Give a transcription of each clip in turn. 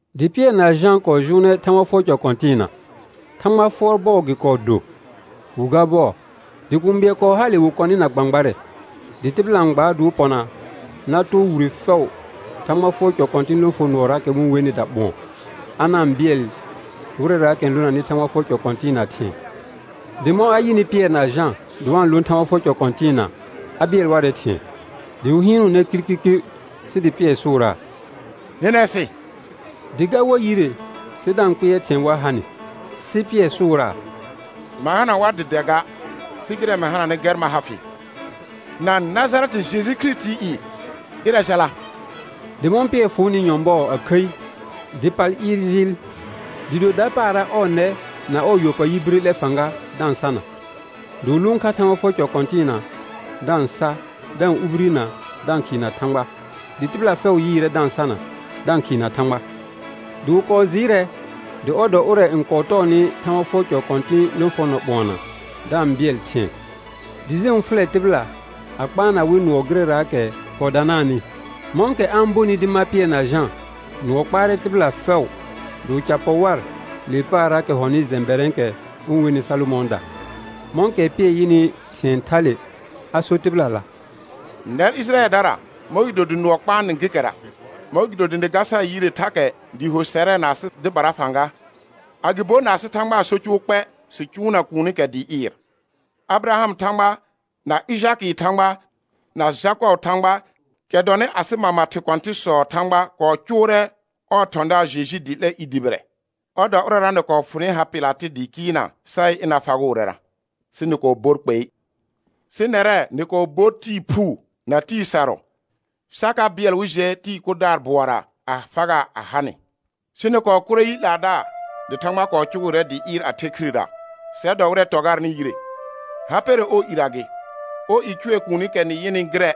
Dɩ Pɩɛr na Jã kɔɔ jʋʋnɛ Thãgba fʋɔr cɔ kɔ̃tɩɩna; Thãgba fʋɔr bɔɔ gɩ kɔɔ do wi ga bɔɔ. Dɩ kũu bɩɛl kɔɔ hale wɩ kɔnɩ na gbãgbarɛ; dɩ tɩbɩla n gbaa dɩ wɩ pɔna na too wire fɛʋ Thãgba fʋɔr cɔ kɔ̃tɩ̃ lõfonʋɔraakɛ wɩ-n wenɩ Daɓʋ̃ɔ, a na-n bɩɛl wɩrɛraakɛ n lonanɩ Thãgba fʋɔr cɔ kɔ̃tɩɩna thɩ̃ɛ. Dɩ mɔ̃ a yɩnɩ Pɩɛr na Jã dɩ wa-n lõ Thãgba fʋɔr cɔ kɔ̃tɩɩna, a bɩɛl warɛ thɩ̃ɛ, dɩ wɩ hɩɩnʋʋnɛ kirkirkir sɩ dɩ Pɩɛr sʋʋraa: Hɩnɛ sɩ. Dɩ ga war yire sɩ da-n kpɩɛr thɩ̃ɛ wa ha nɩ. Sɩ Pɩɛr sʋʋraa: Ma hana war dɩ dɛ ga, sɩ gɩrɛ mɩ hananɩ gɛr ma ha fɩ; na Najarɛtɩ Jeju Kirisitii i, ɩrɛ jala. Dɩ mɔ̃ Pɩɛr fʋʋnɩ nyɔ̃bɔɔ a khəi dɩ pal ɩɩr jɩɩl, dɩɩ do dapaara ɔɔ nɛ na ɔɔ yɔpayi bire 'lɛ fãga da-n sana; dɩ wɩ lʋʋn kha Thãgba fʋɔr cɔ kɔ̃tɩɩna da-n sa, da-n ubirina, da-n khɩɩna Thãgba. Dɩ tɩbɩla fɛʋ yɩɩrɛ da-n sana, da-n khɩɩna Thãgba. Dɩ wɩ kɔɔ jɩɩrɛ dɩ ɔr dɔ ʋrɛ n kɔɔ tɔɔnɩ Thãgba fʋɔr cɔ kɔ̃tɩ̃ lõfonɔ Ɓʋɔna, da-n bɩɛl thɩ̃ɛ; dɩ jẽu fʋlɛ tɩbɩla a kpaana wɩ nʋɔ gɩrɛraakɛ kɔɔ danaanɩ. Mɔ̃kɛ a-n bonɩ dɩ ma Pɩɛr na Jã, nʋɔ kpaarɛ tɩbɩla fɛʋ dɩ wɩ ca pɔ war le paarraakɛ hɔnɩ jɛ̃bɛrɛ̃ɛkɛ wɩ-n wenɩ Salomɔ̃ɔda. Mɔ̃kɛ Pɩɛr yɩnɩ thɩ̃ɛ thale a sor tɩbɩlala: Nɛr Ɩjɩrayɛldara, mɔ̃gɩdo dɩ nʋɔ kpaa nɩ gekɛra? Mɔ̃gɩdo dɩ nɩ ga sar yire thakɛ dɩɩ ho sɛrɛ na asɩ dɩbara fãga, agɩbo na asɩ Thãgba so cʋʋ kpɛ, sɩ cʋʋna kuunikɛ dɩ ɩɩr? Abɩrahamɩ Thãgba, na Ɩjakɩɩ Thãgba, na Jakɔbɩɩ Thãgba, kɛ dɔnɩ asɩ mama thɩ kɔ̃tɩ̃sɔɔ Thãgba kɔɔ cʋʋrɛ ɔɔ thɔ̃daar Jeju dɩ 'lɛ i dʋbɩrɛ; ɔr dɔ ʋrɛra nɩ kɔɔ fʋnɩ ha Pɩlatɩ dɩ kɩɩlnaa sa yɩ ɩna fagʋʋrɛra, sɩ nɩ kɔɔ bor kpei. Sɩ nɛrɛ nɩ kɔɔ bor Tɩɩ phuu na Tɩɩ sarʋ, sa ka bɩɛl wɩ jɛ tɩɩ kʋdaar bʋɔra a fagaa a ha nɩ. Sɩ nɩ kɔɔ kʋrɛ yi 'laadaar, dɩ Thãgba kɔɔ cʋgʋʋrɛ dɩ ɩɩr a the khirera, sɛr dɔ wɩtrɛ tɔ garnɩ yire. Ha pɛrɛ ɔɔ irə gɩ, ɔɔ i cʋɛ kuunikɛ nɩ yɩnɩ gɩrɛ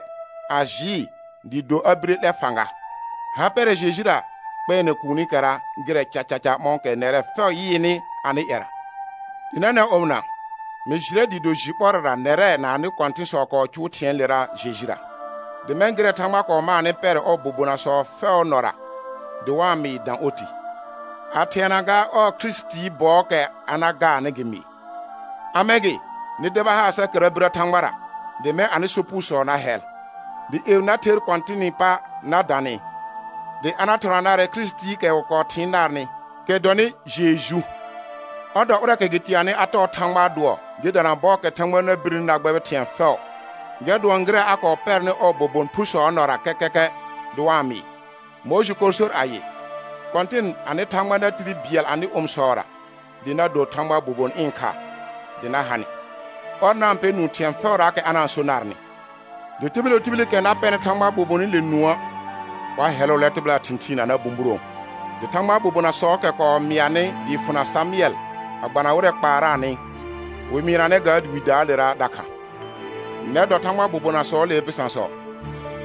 a jɩɩ dɩɩ do a bire 'lɛ fãga; ha pɛrɛ Jejura kpɛɛnɛ kuunikɛra gɩrɛ cacaca mɔ̃kɛ nɛrɛ fɛʋ yɩɩnɩ anɩ ƴɛra. Dɩ nɛnɛ̃ omɩna, mɩ jɩrɛ dɩɩ do jɩ ɓɔrɛra nɛrɛ na anɩ kɔ̃tɩ̃sɔ kɔɔ cʋʋ thɩ̃ɛɛlera Jejura; dɩ mɛ̃ gɩrɛ Thãgba kɔɔ maanɩ pɛrɛ ɔɔ bobonasɔ fɛʋʋ nɔra dɩ wa-n mɩɩ dã oti, a thɩɛna gaa ɔɔ Kirisitii bɔɔkɛ a na gaarnɩ gɩ mɩɩ. A mɛ̃ gɩ, nɩ deba haar sa kɛra birə Thãgbara, dɩ mɛ̃ anɩ sopugosɔ na hɛl; dɩ ƴeu na ther Kɔ̃tɩnɩ pa na dã nɩ, dɩ a na thɔna narɛ Kirisitiikɛ wɩ kɔɔ thɩɩn narnɩ, kɛ dɔnɩ Jeju. Ɔr dɔ ʋrɛɛkɛ gɩ teenanɩ a tɔɔ Thãgbaa dʋɔ, gɩ dana bɔɔkɛ Thãgba na birni na gbɛbɩ thɩ̃ɛ fɛʋ, gɛr dʋɔn gɩrɛ a kɔɔ pɛrnɩ ɔɔ bobon phusɔɔ nɔra kɛkɛkɛ dɩ wa-n mɩɩ. Mʋɩjɩ kɔɔ sor ayɩ: «Kɔ̃tɩn anɩ Thãgba na tire bɩɛl anɩ omisɔra dɩ na do Thãgbaa bobon ɩ̃ kha dɩ na ha nɩ; ɔr na-n pɛ nũu thɩ̃ɛ fɛʋraakɛ a na-n so narnɩ. Dɩ tibil wo tibilikɛ na pɛnɩ Thãgbaa bobonɩle nũə', wa hɛlʋʋlɛ tɩbɩlaa thɩ̃thɩɩn a na bũburõo.» Dɩ Thãgbaa bobonasɔɔkɛ kɔɔ mɩanɩ dɩɩ fʋna Samʋɛl a gbana wɩrɛ kɔɔ kpaaraanɩ, wɩ mɩɩnanɛ ga Widaalera dakha. Nɛr dɔ Thãgbaa bobonasɔɔlee bɩsãsɔ,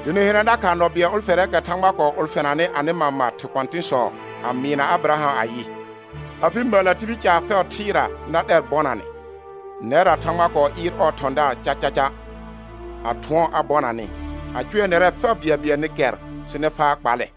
dɩ nɩ hɩnɛ dakha nɔ bɩɛl ʋlfɛrɛɛkɛ Thãgba kɔɔ ʋlfɛnanɩ anɩ mama thɩ kɔ̃tɩ̃sɔ a mɩɩna Abɩraham ayɩ: «Afɩ məllə tibil caar fɛʋ thɩɩra na 'lɛr bɔnanɛ.» Nɛrra Thãgba kɔɔ ɩɩr ɔɔ thɔ̃daar cacaca, a thʋɔn a bɔna nɩ, a cʋɛ nɛrɛ fɛʋ bɩɛlbɩɛl nɩ kɛr sɩ nɩ faa kpallɛ.